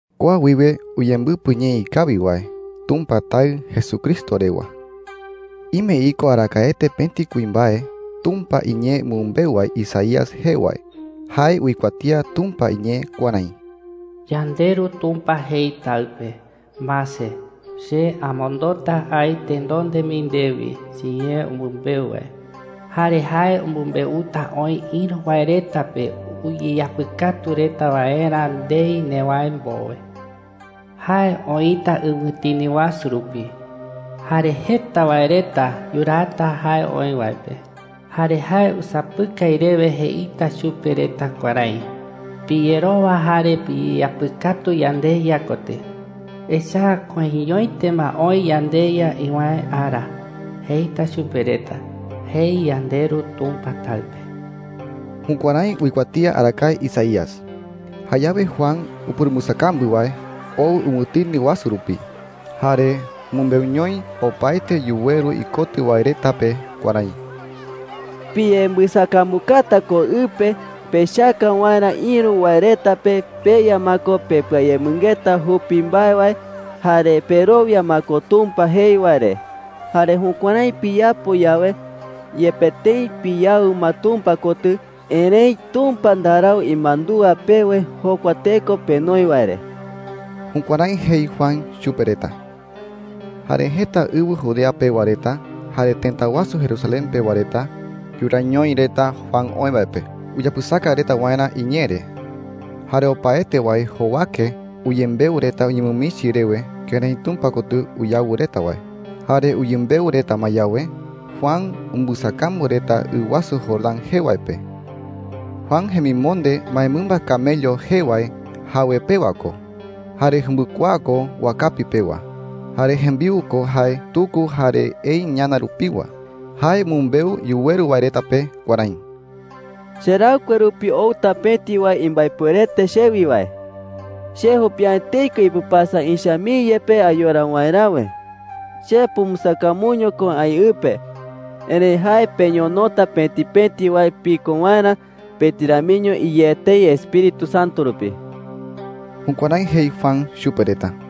Kua wiwe uyembɨpɨ ñee ikawi wae Tumpa Taɨ Jesucristo rewa. Ime iko arakaete pëti kuimbae Tumpa iñee umɨmbeu wae Isaías jee wae. Jae uikuatía Tumpa iñee kuärái: “YandeRu Tumpa jei Taɨ pe: ‘Mase, che amondota aï tenonde mii ndewi chiñee umɨmbeu wae. Jare jae umɨmbeuta oï ïru wae reta pe uyeyapɨkatu reta waerä ndei newäe mbowe. Jae oïta ɨwɨtini wasu rupi, jare jeta wae reta yuraata jae oï wae pe. Jare jae usapɨkai rewe jeita chupe reta kuärái: ‘Piyerowa jare piyeyapɨkatu yandeYa kotɨ, echa’ä koiñoete ma oï yandeYa iwäe ara,’ jeita chupe reta,’ jei yandeRu Tumpa Taɨ pe.” Jukuärái uikuatía arakae Isaías. Jayawe Juan upurumbɨsakambu wae oo ɨwɨtini wasu rupi, jare umɨmbeuñoi opaete yuweru ikotɨ wae reta pe kuärái: “Piyembɨsakambukata ko ɨ pe pechaka waerä ïru wae reta pe peya ma ko pepɨayemɨngeta jupi mbae wae jare perowia ma ko Tumpa jei wae re. Jare jukuärái piyapo yawe, yepe tëi piyawɨ ma Tumpa kotɨ, erëi Tumpa ndarau imandúa pewe jokua teko penoi wae re.” Jukuärái jei Juan chupe reta. Jare jeta ɨwɨ Judea pewa reta jare tëta wasu Jerusalén pewa reta yuraañoi reta Juan oï wae pe uyapɨsaka reta waerä iñee re. Jare opaete wae jowake uyembeu reta uñemɨmichi rewe kërái Tumpa kotɨ uyawɨ reta wae. Jare uyembeu reta ma yawe, Juan umbɨsakambu reta ɨ wasu Jordán jee wae pe. Juan jemimonde mbaemɨmba camello jee wae jawe pewa ko, jare jumbɨkuaa ko wakapi pewa. Jare jembiu ko jae tuku jare ei ñana rupiwa. Jae umɨmbeu yuweru wae reta pe kuärái: “Cheraɨkue rupi outa pëti wae imbaepuerete chewi wae,” jei. “Che jupi’ä etei ko ipɨpasa ïcha mii yepe ayora waeräwe,” jei. “Che pumbɨsakambuño ko aï ɨ pe, erëi jae peñonota pëti pëti wae piko waerä pëti ramiño iyé etei Espíritu Santo rupi.” Jukuärái jei Juan chupe reta.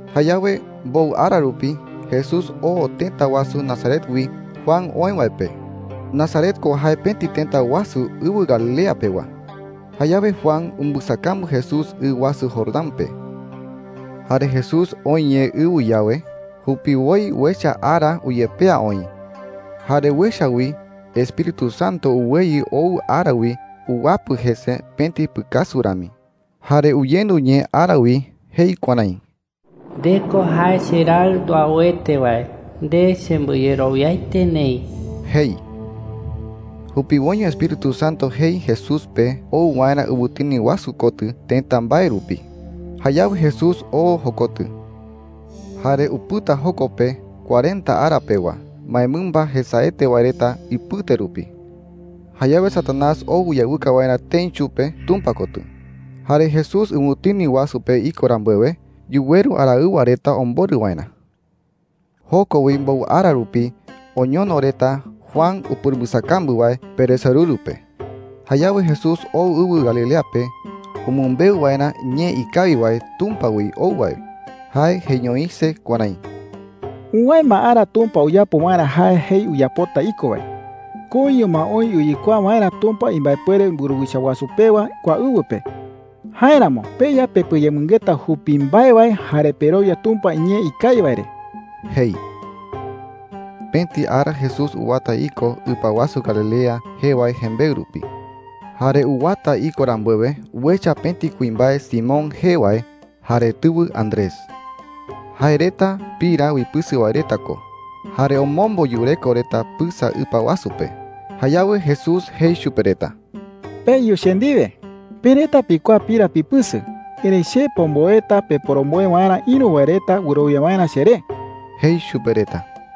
Jayawe mbowɨ ara rupi Jesús oo tëta wasu Nazaret wi Juan oï wae pe. Nazaret ko jae pëti tëta wasu ɨwɨ Galilea pewa. Jayawe Juan umbɨsakambu Jesús ɨ wasu Jordán pe. Jare Jesús oë ye ɨ wi yawe, jupiwoi uecha ara uyepea oï. Jare uecha wi Espíritu Santo uweyɨ ou ara wi uwapɨ jese pëti pɨkasu rami. Jare uyendu ñee ara wi jei kuärái: “Nde ko jae cheRaɨ nduauete wae. Nde chembɨyerowiaete neï,” jei. Jupiwoiño Espíritu Santo jei Jesús pe oo waerä ɨwɨtini wasu kotɨ tëta mbae rupi. Jayawe Jesús oo jokotɨ. Jare upɨta joko pe cuarenta ara pewa mbaemɨmba jesaete wae reta ipɨte rupi. Jayawe Satanás Añawasu jee ko Satanás. ou uyawɨka waerä tëi chupe Tumpa kotɨ. Jare Jesús ɨwɨtini wasu pe iko rambuewe, yuweru araɨwa reta omborɨ waerä. Joko wi mbowɨ ara rupi, oñono reta Juan upurumbɨsakambu wae peresorɨru pe. Jayawe Jesús oo ɨwɨ Galilea pe umɨmbeu waerä ñee ikawi wae Tumpa wi ou wae. Jae jeiñoise kuärái: “Uwäe ma ara Tumpa uyapo waerä jae jei uyapota iko wae. Koiño ma oï uyekuaa waerä Tumpa imbaepuere mburuwicha wasu pewa kua ɨwɨ pe. Jáeramo peya pepɨayemɨngeta jupi mbae wae jare perowia Tumpa iñee ikawi wae re,” jei. Pëti ara Jesús uwata iko ɨpa wasu Galilea jee wae jembeɨ rupi. Jare uwata iko rambuewe, uecha pëti kuimbae Simón jee wae jare tɨwɨ Andrés. Jae reta pira uipɨsɨ wae reta ko jare omombo yureko reta pɨsa ɨpa wasu pe. Jayawe Jesús jei chupe reta: “Peyu che ndiwe,” jei. “Pe reta pikuaa pira pipɨsɨ, erëi che pomboeta peporomboe waerä, ïru wae reta wɨrowia waerä cheré,” jei chupe reta.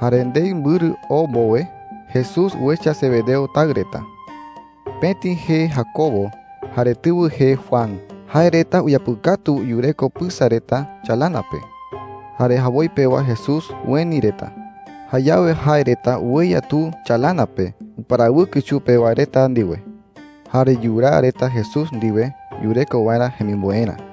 Jare ndei mbɨrɨ oo mbowe, Jesús uecha Zebedeo taɨ reta. Pëti jee Jacobo, jare tɨwɨ jee Juan. Jae reta uyapɨkatu yureko pɨsa reta chalana pe. Jare jawoi pewa Jesús ueni reta. Jayawe jae reta ueya tu chalana pe uparawɨkɨ chupe wae reta ndiwe, jare yuraa reta Jesús ndiwe yureko waerä jemimboerä.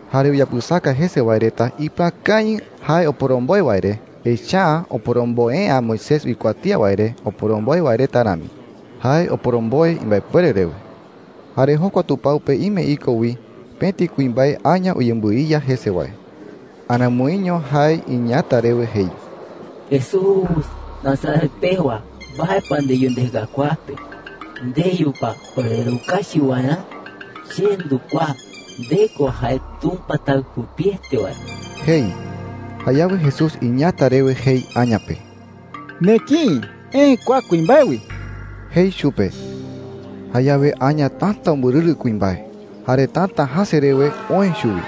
Jare uyapɨsaka jese wae reta ipɨakañɨ jae oporomboe wae re, echa’ä oporomboe’ä Moisés uikuatía wae re oporomboe wae reta rami. Jae oporomboe imbaepuere rewe. Jare jokua tupao pe ime iko wi pëti kuimbae aña uyembɨiya jese wae. Aramoiño jae iñeeäta rewe jei: “Jesús Nazaret pewa, ¿mbae pa ndeyu ndeka kua pe?” jei. “¿Ndeyu pa orerukachi waerä? Che ndukuaa. Nde ko jae Tumpa Taɨ jupiete wae,” jei. Jayawe Jesús iñeeäta rewe jei aña pe: “¡Nekïi! Eë kua kuimbae wi,” jei chupe. Jayawe aña täta umbɨrɨrɨ kuimbae, jare täta jäse rewe oë chuwi.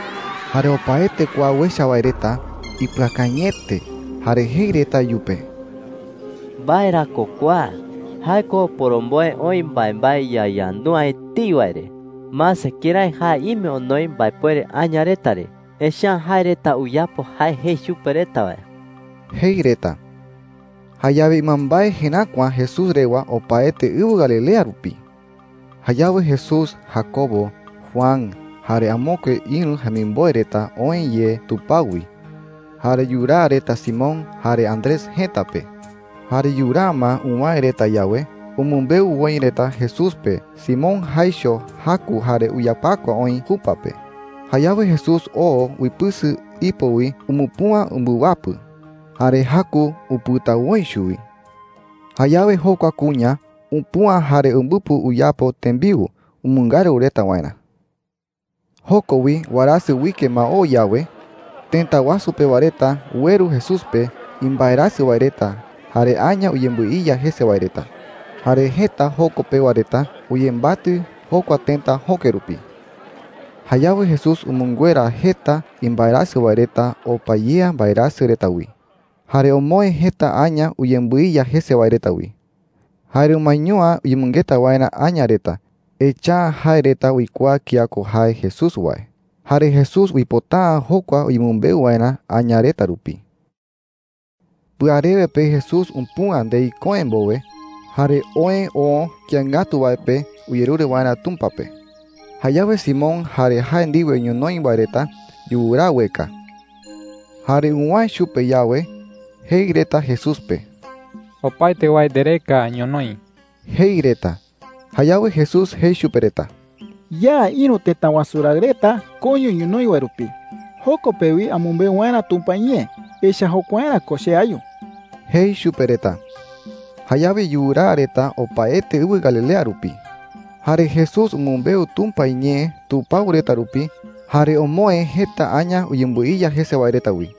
Jare opaete kua uecha wae reta ipɨakañɨete jare jei reta iyupe: “¿Mbae ra ko kua? Jae ko oporomboe oï mbaembae yayandu’ä etei wae re. Mase kërái jae ime onoi mbaepuere aña reta re. Echa’ä jae reta uyapo jae jei chupe reta wae,” jei reta. Jayawe ɨmambae jeräkua Jesús rewa opaete ɨwɨ Galilea rupi. Jayawe Jesús, Jacobo, Juan, jare amokue ïru jemimboe reta oë ye tupao wi, jare yuraa reta Simón jare Andrés jëta pe. Jare yuraa ma uwäe reta yawe, umɨmbeu woi reta Jesús pe Simón jaicho jaku jare uyapakua oï jupa pe. Jayawe Jesús oo uipɨsɨ ipo wi umupüa umbɨwapɨ. Jare jaku upɨta woi chuwi. Jayawe jokua kuña upüa jare umbɨpɨ uyapo tembiu umɨngaru reta waerä. Joko wi, warasɨ uike ma oo yawe, tëta wasu pewa reta ueru Jesús pe imbaerasɨ wae reta jare aña uyembɨiya jese wae reta. Jare jeta joko pewa reta uyembatɨ jokua tëta jöke rupi. Jayawe Jesús umɨnguera jeta imbaerasɨ wae reta opa yea mbaerasɨ reta wi, jare omoë jeta aña uyembɨiya jese wae reta wi. Jare umaeño’ä uyemɨngeta waerä aña reta, echa’ä jae reta uikuaa kía ko jae Jesús wae. Jare Jesús uipota’ä jokua uyemɨmbeu waerä aña reta rupi. Pɨarewe pe Jesús upüa ndei köe mbowe, jare oë oo kïi ngatu wae pe uyerure waerä Tumpa pe. Jayawe Simón jare jae ndiwe ñonoï wae reta yuraa ueka. Jare uwäe chupe yawe, jei reta Jesús pe: “Opaete wae ndereka ñonoï,” jei reta. Jayawe Jesús jei chupe reta: “Ya ïru tëta wasu raɨ reta koiño ñonoï wae rupi, joko pe wi amɨmbeu waerä Tumpa iñee. Echa’ä jokuaerä ko che ayu,” jei chupe reta. Jayawe yuraa reta opaete ɨwɨ Galilea rupi. Jare Jesús umɨmbeu Tumpa iñee tupao reta rupi, jare omoë jeta aña uyembɨiya jese wae reta wi.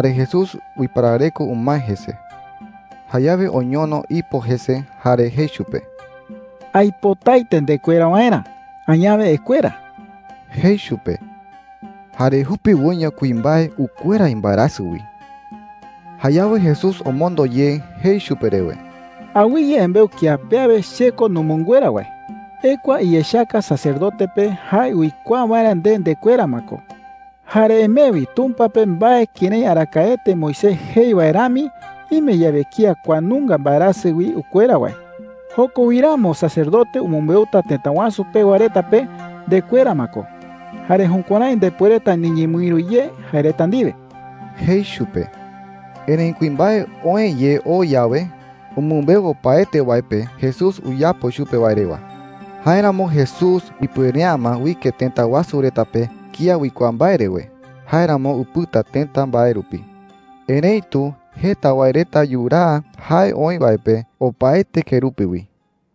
Jare Jesús uiparareko umae jese. Jayawe oñono ipo jese jare jei chupe: “Aipotaete ndekuera waerä. Añawe ekuera,” jei chupe. ¡Jare jupiwoiño kuimbae ukuera imbaerasɨ wi! Jayawe Jesús omondo ye jei chupe rewe: “Awɨye embeu kía pe awe che ko numɨnguera wae,” jei. “Ekua iyechaka sacerdote pe jae uikuaa waerä nde ndekuera ma ko. Jare emee wi Tumpa pe mbae kërái arakaete Moisés jei wae rami, ime yawe kía kua nunga mbaerasɨ wi ukuera wae. Joko wi ramo sacerdote umɨmbeuta tëta wasu pewa reta pe ndekuera ma ko, jare jukuärái ndepuereta niñemɨïru ye jae reta ndiwe,” jei chupe. Erëi kuimbae oë ye oo yawe, umɨmbeu opaete wae pe Jesús uyapo chupe wae rewa. Jáeramo Jesús ipuere’ä ma uike tëta wasu reta pe kía uikuaa mbae rewe. Jáeramo upɨta tëta mbae rupi. Erëitu jeta wae reta yuraa jae oï wae pe opaete kerupi wi.